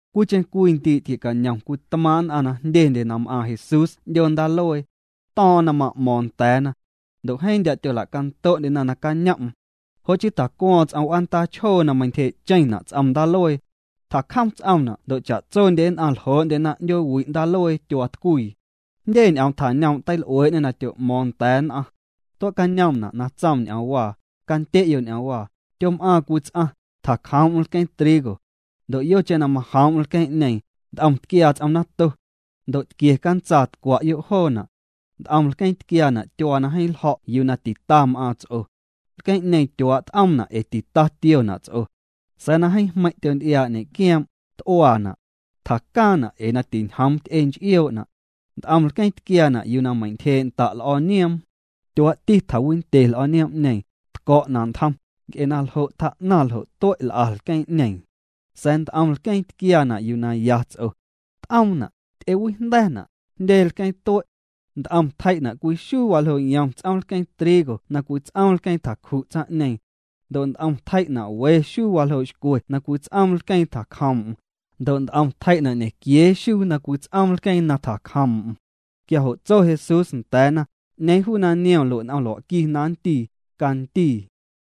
Cwiicheⁿ cwii ndii' tquie'cañom cwii tmaaⁿ' nn'aⁿ na jndyendye na m'aaⁿ Jesús 'ndyoo ndaaluee. To̱o̱ⁿ'o̱ⁿ na ma'mo̱o̱ⁿ nda̱a̱na. Ndo' jeeⁿ ndya' tyola'canto'ndyena nacañom'm. Jo' chii tjacuo̱o̱ⁿ ts'om w'aandaa chjoo na meintyje'cheⁿna' ts'om ndaaluee. Tjacjom ts'omna' ndo' cha'tsondye nn'aⁿ ljoo'ndyena 'ndyoowi' ndaaluee tyuaatcwii. Jndye ñ'oom tjañoom' teil'uee'ñê na tyo'mo̱o̱ⁿ nda̱a̱ nn'aⁿ. Tue'cañoomna' na tsoom ñ'oomwaa: —Candye'yo' ñ'oomwaa: Tyom'aaⁿ cwii ts'aⁿ, tjacjoom'm lqueeⁿ trigo. Ndo' yocheⁿ na majoom'm lqueeⁿ'ñee, nt'om tquiaa ts'om nato. Ndo' tquie cantsaa, tcwa'yo' joona'. Nt'om lqueeⁿ tquiaana' tyuaa na jeeⁿ ljo̱' yuu na tita m'aaⁿ ts'o. Lqueeⁿ'ñeeⁿ tyuaa' t'oomna' ee tita tiona' ts'o. Sa̱a̱ na jeeⁿ jmeiⁿ' tyonty'iaa' ñe'quioom', t'uaana'. Tjacaaⁿna' ee na tinjoom ty'e nch'ioo'na'. Nt'om lqueeⁿ tquiaana' yuu na meintyjee' nda' l'o̱o̱ nioom. Tyuaa'ti tjawindye l'o̱o̱ nioom'ñeeⁿ, tco̱'na' ntjom, nc'e naljo' tjaa'naⁿ ljo' tue' l'a lqueeⁿ'ñeeⁿ. Sa̱a̱ nt'om lqueeⁿ tquiaana' yuu na ya ts'o. T'oomna', ty'ewijnda̱na', jndye lqueeⁿ tue'. Nt'om tjei'na' cwii xuu waljoo' yom ts'oom lqueeⁿ trigo na cwii ts'oom lqueeⁿ tjacju' tsaⁿ'ñeeⁿ. Ndo' nt'om tjei'na' we xuu waljoo' xcwe na cwii ts'oom lqueeⁿ tjacjoom'm. Ndo' nt'om tjei'na' ñequiee xuu na cwii ts'oom lqueeⁿ na tjacjoom'm. Quia jo' tso Jesús nda̱a̱na: —'Ñeeⁿ juu na niom lue' n'om lua'qui na nndii, candii.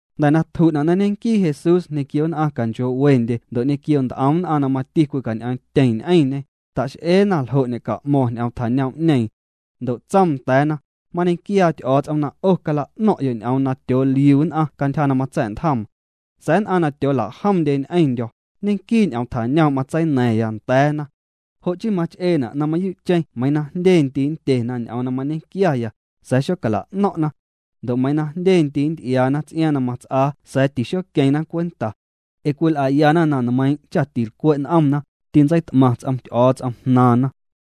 Jnda̱ na tju'na' na ñenquii Jesús ñequio nn'aⁿ canchoo'wendye ndo' ñequio nt'om nn'aⁿ na mati cwicañ'eeⁿtyeⁿ ñ'eⁿñê, ta'x'eena ljo' ñe'ca'mo̱ⁿ ñ'oom tjañoom'ñeeⁿ. Ndo' tsoom nda̱a̱na: —Mañequiaa Ty'o̱o̱ts'om na 'o cala'no̱ⁿ'yo' ñ'oom na tyooliu nn'aⁿ cantyja na matsa̱'ntjoom. Sa̱a̱ nn'aⁿ na tyoola'jomndye ñ'eⁿndyo̱, ñenquii' ñ'oom tjañoom' matseina̱ⁿya nda̱a̱na. Jo' chii mach'eena' na mayuu'cheⁿ meiiⁿ na jndye ndii' nndyena ñ'oom na mañequiaya, sa̱a̱ xocala'no̱ⁿ'na. Ndo' meiiⁿ na jndye ndii' nnty'iaana ts'iaaⁿ na mats'aa sa̱a̱ tixoqueⁿna cwenta. Ee cwil'ayana na nmeiiⁿ' cha tilcwe' n'omna, tintseit'maⁿ ts'om Ty'o̱o̱ts'om jnaaⁿna.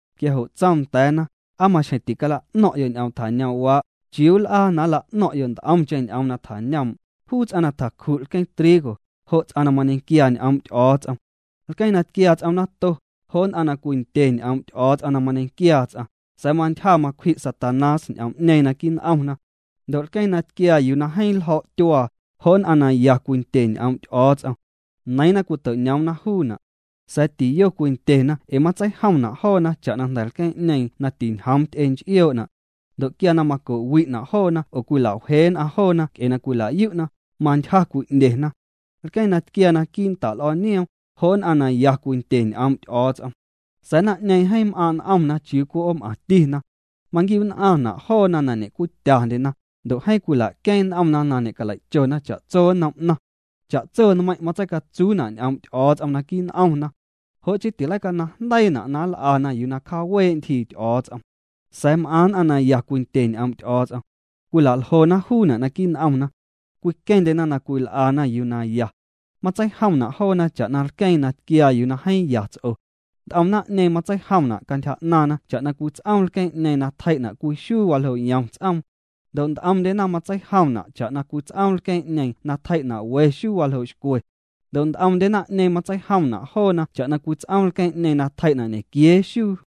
Quia jo' tsoom nda̱a̱na: —¿Aa maxjeⁿ ticala'no̱ⁿ'yo' ñ'oom tjañoom'waa'? ¿Chiuu nl'aa na nla'no̱ⁿ'yo' nt'omcheⁿ ñ'oom tjañoom'? Juu ts'aⁿ na tjacju' lqueeⁿ trigo, jo' ts'aⁿ na mañequiaa ñ'oom' Ty'o̱o̱ts'om. Lqueeⁿ na tquiaa ts'om nato, jo' nn'aⁿ na cwindye ñ'oom' Ty'o̱o̱ts'om na mañequiaa ts'aⁿ, sa̱a̱ mantyja macwji' Satanás ñ'oom'ñeeⁿ naquii' n'omna. Ndo' lqueeⁿ na tquiaa yuu na jeeⁿ ljo̱' tyuaa, jo' nn'aⁿ na ya cwindye ñ'oom' Ty'o̱o̱ts'om. Neiiⁿna cwito'ñoomna juuna'. Sa̱a̱ tiyo cwindyena ee matseijomna' joona cha'na jnda̱ lqueeⁿ'ñeeⁿ na tinjoom ty'e nch'ioo'na'. Ndo' quia na maco'wi'na' joona oo cwila'wjee nn'aⁿ joona nc'e na cwila'yu'na, mantyja cwi'ndyena. Lqueeⁿ na tquiaa naquii' l'o̱o̱ nioom, jo' nn'aⁿ na ya Cwindye ñ'oom' Ty'o̱o̱ts'om. Sa̱a̱ naⁿ'ñeeⁿ jeeⁿ m'aaⁿ' n'omna chiuu cwii 'oom'aⁿtina. Maquiu'nn'aⁿna' joona na ñe'cwityandyena, ndo' jeeⁿ cwila'queeⁿ n'omna na ñe'calei'chona cha'tso nnom 'naⁿ. Cha'tso nmeiⁿ' matseicatsuuna' ñ'oom' Ty'o̱o̱ts'om naquii' n'omna. Jo' chii tileicanaⁿjndeiina' na nl'ana yuu na cjawee' ntyjii Ty'o̱o̱ts'om. Sa̱a̱ m'aⁿ nn'aⁿ na ya cwindye ñ'oom' Ty'o̱o̱ts'om. Cwila'ljona juuna' naquii' n'omna. Cwiqueⁿndyena na cwil'ana yuu na ya. Matseijomna' joona cha'na lqueeⁿ na tquiaa yuu na jeeⁿ ya ts'o. Nt'om naⁿ'ñeeⁿ matseijomna' cantyja 'naaⁿna cha'na cwii ts'oom lqueeⁿ'ñeeⁿ na tjei'na' cwii xuu waljoo' yom ts'oom. Ndo' nt'omndyena matseijomna' cha'na cwii ts'oom lqueeⁿ'ñeeⁿ na tjei'na' we xuu waljoo' xcwe. Ndo' nt'omndye naⁿ'ñeeⁿ matseijomna' joona cha'na cwii ts'oom lqueeⁿ'ñeeⁿ na tjei'na' ñequiee xuu.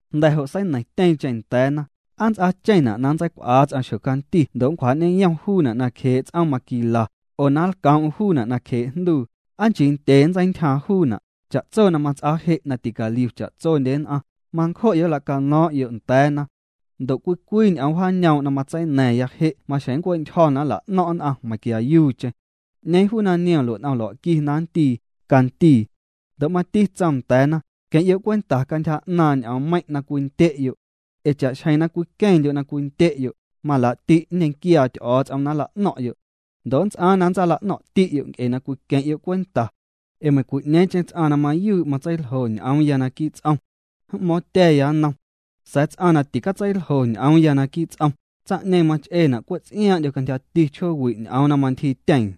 Jnda̱ jo' seineiⁿtyeeⁿcheⁿ nda̱a̱na: —¿Aa nnts'aacheⁿna' na nntseicw'aa ts'aⁿ xjocanti ndo' nncwjaa'ñeyom juuna' nacjee' ts'oom maquila, oo na nlcoom'm juuna' nacjee' jnduu? ¿Aa nchii ndye nntseintyjaaⁿ juuna'? Cha'tso na mats'aa je' na ticaliu cha'tsondye nn'aⁿ, mancjo'yo' nlacano̱o̱ⁿ'yo' nda̱a̱na. Ndo' cwii cwii ñ'oom wjaañoom' na matseina̱ⁿya je' maxjeⁿ nncue'ntyjo̱ na nla'no̱ⁿ' nn'aⁿ meiⁿnquiayuucheⁿ. 'Ñeeⁿ juu na niom lue' n'om lua'qui na nndii, candii. Ndo' mati tsoom nda̱a̱na: —Queⁿ'yo' cwenta cantyja 'naaⁿ ñ'oommeiⁿ' na cwindye'yo'. Ee cha'xjeⁿ na cwiqueⁿndyo' na cwindye'yo', malaa'ti' nñequiaa Ty'o̱o̱ts'om na nla'no̱ⁿ'yo'. Ndo' nnts'aaⁿ na nntsaala'no̱ⁿ'ti'yo' nc'e na cwiqueⁿ'yo' cwenta. Ee meiⁿcwi'ñeeⁿcheⁿ ts'aⁿ na mayuu' matseiljo ñ'oomya naquii' ts'om, m'mo̱o̱ⁿtya̱ya nnom. Sa̱a̱ ts'aⁿ na ticatseiljo ñ'oomya naquii' ts'om, tsaⁿ'ñeeⁿ mach'eena' cwe' ts'iaaⁿ'ndyo cantyjati chjoowi' ñ'oom na mantyjiityeeⁿ.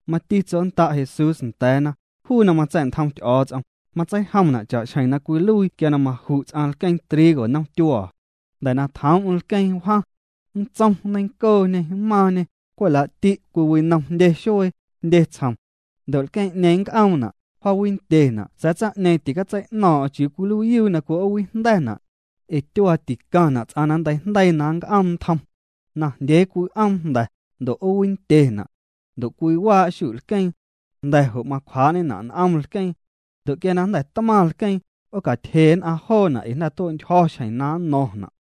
Mati tsonnda' Jesús nda̱a̱na: —Juu na matsa̱'ntjom Ty'o̱o̱ts'om, matseijomna' cha'xjeⁿ na cwiluii quia na maju' ts'aⁿ lqueeⁿ trigo nomtyuaa. Jnda̱ na tjoom'm lqueeⁿ wjaⁿ. Nntsom, nneiⁿncooñê, mmaaⁿñê, cwe' laa'ti' cwiwinom jndye xuee, jndye tsjom. Ndo' lqueeⁿ'ñeeⁿ nnc'oomna', wjaawindyena' sa̱a̱ tsaⁿ'ñeeⁿ ticatsei'no̱o̱ⁿ'o̱ⁿ chiuu cwiluiiyuu na cwi'oowijnda̱na'. Ee tyuaa ticaⁿna' ts'aⁿ na nnteijndeii na nnc'oom ntjom. Najndyee cwi'oom jnda̱, ndo' 'oowindyena'. Ndo' cwiwaa' xu'lqueeⁿ. Jnda̱ jo' macwjaa'ñena' n'om lqueeⁿ. Ndo' quia na jnda̱ tmaⁿ lqueeⁿ, 'oocatyje nn'aⁿ joona' ee na jnda̱ tue'ntyjo̱ xjeⁿ na nno̱ⁿna'.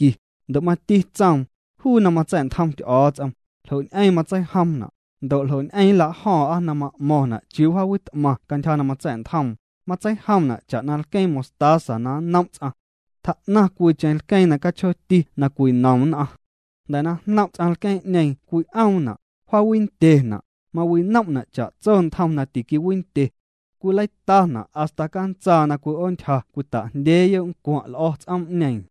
Ndo' mati tsoom: —Juu na matsa̱'ntjom Ty'o̱o̱ts'om, ¿ljo' ñ'eⁿ matseijomna'? Ndo' ¿ljo' ñ'eⁿ nlajo̱o̱ⁿ'a na m'mo̱ⁿna' chiuu jaawit'maⁿ cantyja na matsa̱'ntjoom? Matseijomna' cha'na cwii lqueeⁿ mostaza na nnom' ts'aⁿ. Tjaa'naⁿ cwiicheⁿ lqueeⁿ na cachjooti na cwinom nn'aⁿ. Jnda̱ na jnom' ts'aⁿ lqueeⁿ'ñeeⁿ cwi'oomna', wjaawindyena', mawinom'na' cha'tso ntjom na tiquiwindye. Cwileitana' hasta cantsaa na cwi'oontyja cwita'jndyeeyo' ncwaⁿ' l'o̱ ts'oom'ñeeⁿ.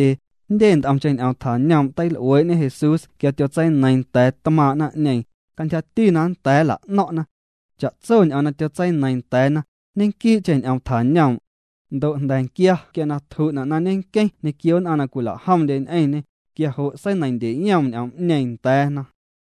Jndye nt'omcheⁿ ñ'oom tjañoom' teil'uee'ñe Jesús quia tyotseineiiⁿ nda̱a̱ tmaaⁿ' naⁿ'neeⁿ, cantyjati na nnda̱a̱ nla'no̱ⁿ'na. Cha'tso ñ'oom na tyotseineiiⁿ nda̱a̱na, ñenquii'cheⁿ ñ'oom tjañoom'. Ndo' jnda̱nquia quia na tju'na' na ñenqueⁿ ñequio nn'aⁿ na cwila'jomndye ñ'eⁿñê, quia jo' seineiⁿndyeyoom ñ'oom'ñeeⁿ nda̱a̱na.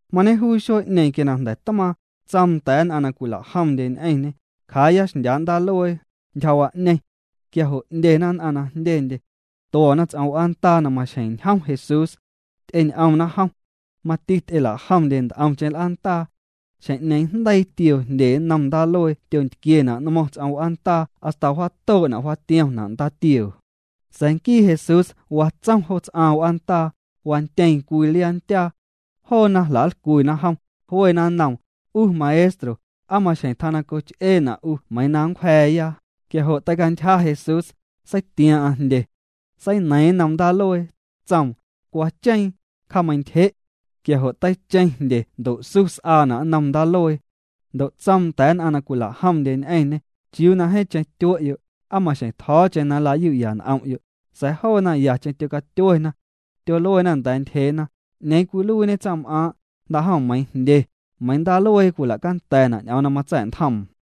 Mañejuu xuee'ñeeⁿ quia na jnda̱ tmaaⁿ, tsoom nda̱a̱ nn'aⁿ na cwila'jomndye ñ'eⁿñê: —Cjaaya xndyaa' ndaaluee, ntyjawa'ñeⁿ. Quia jo' 'ndyena nn'aⁿ na jndyendye. Tuo̱na ts'om w'aandaa na maxjeⁿ njom Jesús. Ty'eñ'omna jom. Mati ty'ela'jomndye nt'omcheⁿ l'aandaa. Xjeⁿ'ñeeⁿ jndeii tioo jndye nnom ndaaluee tyontquiena' nmo̱ⁿ ts'om w'aandaa hasta wjaatoo'na' wjaatiomna' ndaatioo. Sa̱a̱ nquii Jesús watsom jo ts'aaⁿ w'aandaa, wantyeeⁿ cwii liaa ndyaa. Joona jla'nlcwina jom, jluena nnoom: —'U Maestro, ¿aa maxjeⁿ tjaa na coch'eena' 'u meiiⁿ na nncwja̱a̱ya? Quia jo' teicantyja Jesús, seitiaaⁿ'aⁿ jndye. Seineiiⁿ nnom ndaaluee, tsoom: —Cuacheeⁿ, cjameiⁿntyje'. Quia jo' teicheⁿ jndye ndo' su s'aana' nnom ndaaluee. Ndo' tsoom nda̱a̱ nn'aⁿ na cwila'jomndye ñ'eⁿñê: —¿Chiuu na jeeⁿcheⁿ tyue'yo'? ¿Aa maxjeⁿ tjo̱o̱cheⁿ na nlayu'ya n'om'yo'? Sa̱a̱ joona yacheⁿ tyocatyuena. Tyoluena nda̱a̱ ntyjeena: —¿'Ñeeⁿ cwiluiiñe tsaⁿm'aaⁿ'? Jnda'jom meiiⁿ jndye, meiiⁿ ndaaluee cwila'canda̱na' ñ'oom na matsa̱'ntjoom.